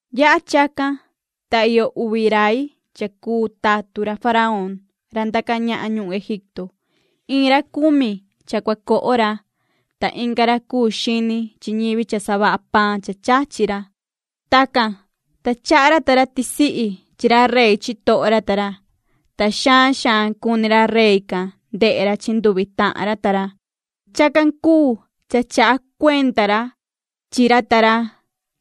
Yaha chacan, ta iyo uvi rai cha cuu tatun ra faraón ra ndaca ñahan ñuhun Egipto. Iin ra cumi cha cua coho ra, ta inga ra cuu xini chi ñivi cha savaha paan cha chachi ra. Tacan, ta chaha ra ta ra tisihi chi ra rey chitoho ra ta ra. Ta xaan xaan cuni ra rey can ndehe ra chi nduvi tahan ra ta ra. Chacan cuu cha chaha cuenda ra chi ra ta ra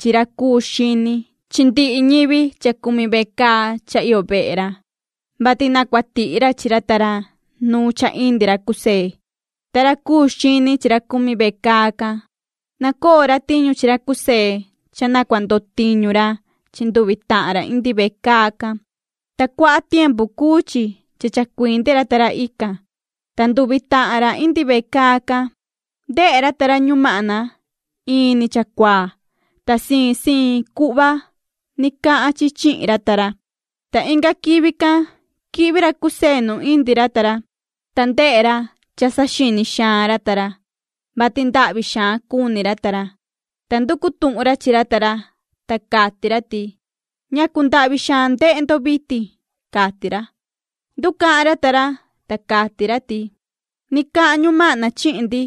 chi ra cuu xini chi ndihi ñivi cha cumi vecaa cha iyo vehe ra, vati na cua tihi ra chi ra ta ra nu cha indi ra José. Ta ra cuu xini chi ra cumi vecaa can, nacoo ra tiñu chi ra José cha na cua ndo tiñu ra chi nduvi tahan ra indi vecaa can, ta cuaha tiempu cuu chi cha chacuindi ra ta ra ican. Ta nduvi tahan ra indi vecaa can, ndehe ra ta ra ñumahna in ni chacuaa, ta siin siin cuhva ni cahan chi chihin ra ta ra. Ta inga quivi can quihvi ra José nu indi ra ta ra, ta ndehe ra cha saxini xaan ra ta ra, vati ndahvi xaan cuni ra ta ra, ta nducu tuhun ra chi ra ta ra, ta cati ra ti: ―¿Ñacu ndahvi xaan ndehe ndo vitin? ―cati ra. Nducahan ra ta ra, ta cati ra ti: ―Ni cahan ñumahna chihin ndi,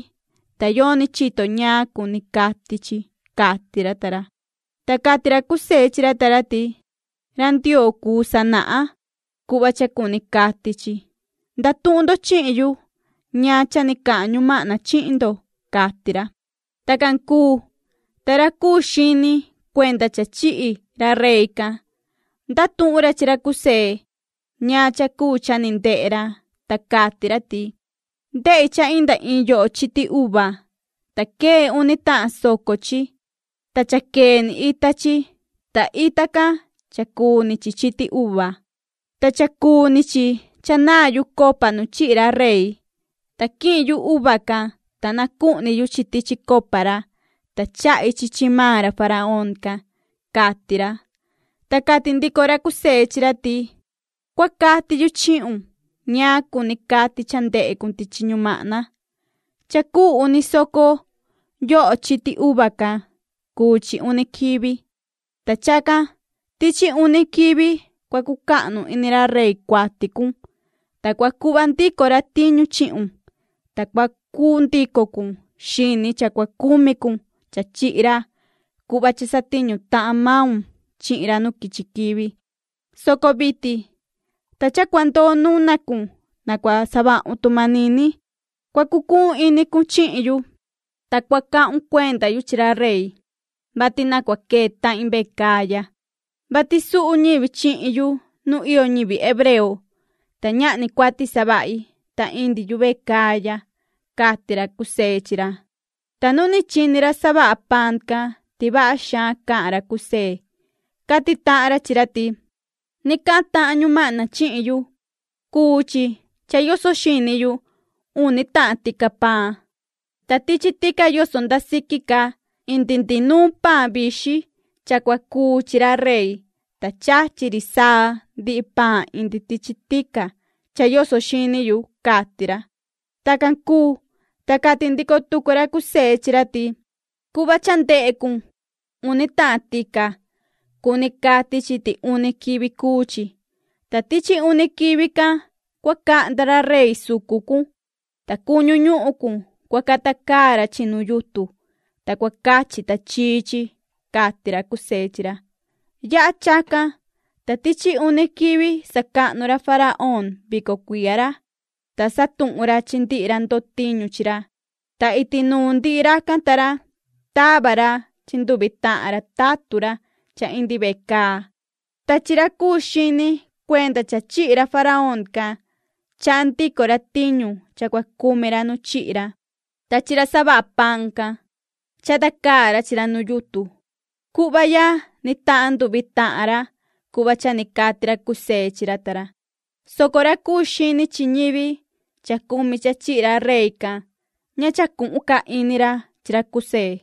ta yoni chito ñaan cuni cati chi ―cati ra ta ra. Ta cati ra José chi ra ta ra ti: ―Ra Ndioo cuu sanahan cuhva cha cuni cati chi. Ndatuhun ndo chihin yu ñaan cha ni cahan ñumahna chihin ndo ―cati ra. Tacan cuu, ta ra cuu xini cuenda cha chihi ra rey can, ndatuhun ra chi ra José ñaan cha cuu cha ni ndehe ra, ta cati ra ti: ―Ndehi cha inda iin yoho chiti uva, ta quee uni tahan soco chi. Ta cha quee ni ita chi, ta ita can cha cuu ni chi chiti uva. Ta cha cuu ni chi cha naa yu copa nu chihi ra rey, ta quihin yu uva can, ta nacuhni yu chi tichi copa ra. Ta chahi chi maan ra faraón can ―cati ra. Ta cati ndico ra José chi ra ti: ―Cua cati yu chihun ñaan cuni cati cha ndehe cun tichi ñumahna. Cha cuu uni soco yoho chiti uva can cuu chi uni quivi. Ta chacan tichi uni quivi cua cucahnu ini ra rey cuati cun. Ta cua cuhva ndico ra tiñu chihun, ta cua cuu ndico cun xini cha cua cumi cun cha chihi ra cuhva cha satiñu tahan maun chihin ra nu quichi quivi, soco vitin ta cha cua ndoo nuna cun na cua savahun tu manini cua cucuhun ini cun chihin yu. Ta cua cahun cuenda yu chi ra rey, vati na cua quee tahin vecaa ya, vati suhu ñivi chihin yu nu iyo ñivi hebreo, ta ñahni cuati savahi, ta indi yu vecaa ya ―cati ra José chi ra. Ta nu ni chini ra savaha paan can ti vaha xaan cahan ra José, cati tahan ra chi ra ti: ―Ni cahan tahan ñumahna chihin yu. Cuu chi cha yoso xini yu uni tahan tica paan. Ta tichi tica yoso nda siqui ca indi ndihi nuun paan vixin cha cua cuu chi ra rey, ta chachi ri saa ndihi paan indi tichi tica cha yoso xini yu ―cati ra. Tacan cuu, ta cati ndico tucu ra José chi ra ti: ―Cuhva cha ndehe cun uni tahan tica, cuni cati chi ti uni quivi cuu chi. Ta tichi uni quivi can cua cahnda ra rey sucu cun, ta cuñu ñuhun cun cua cata caa ra chi nu yutun, ta cua cachi tachii chi ―cati ra José chi ra. Yaha chacan, ta tichi uni quivi sacahnu ra faraón vico cuiya ra. Ta satuhun ra chi ndihi ra ndo tiñu chi ra, ta iti nuun ndihi racan ta ra tava ra chi nduvi tahan ra tatun ra cha indi vecaa. Ta chi ra cuu xini cuenda cha chihi ra faraón can, chaha ndico ra tiñu cha cua cumi ra nu chihi ra, ta chi ra savaha paan can, chata caa ra chi ra nu yutun. Cuhva ya ni tahan nduvi tahan ra cuhva cha ni cati ra José chi ra ta ra, soco ra cuu xini chi ñivi cha cumi cha chihi ra rey can, ña cha cuhun ca ini ra chi ra José.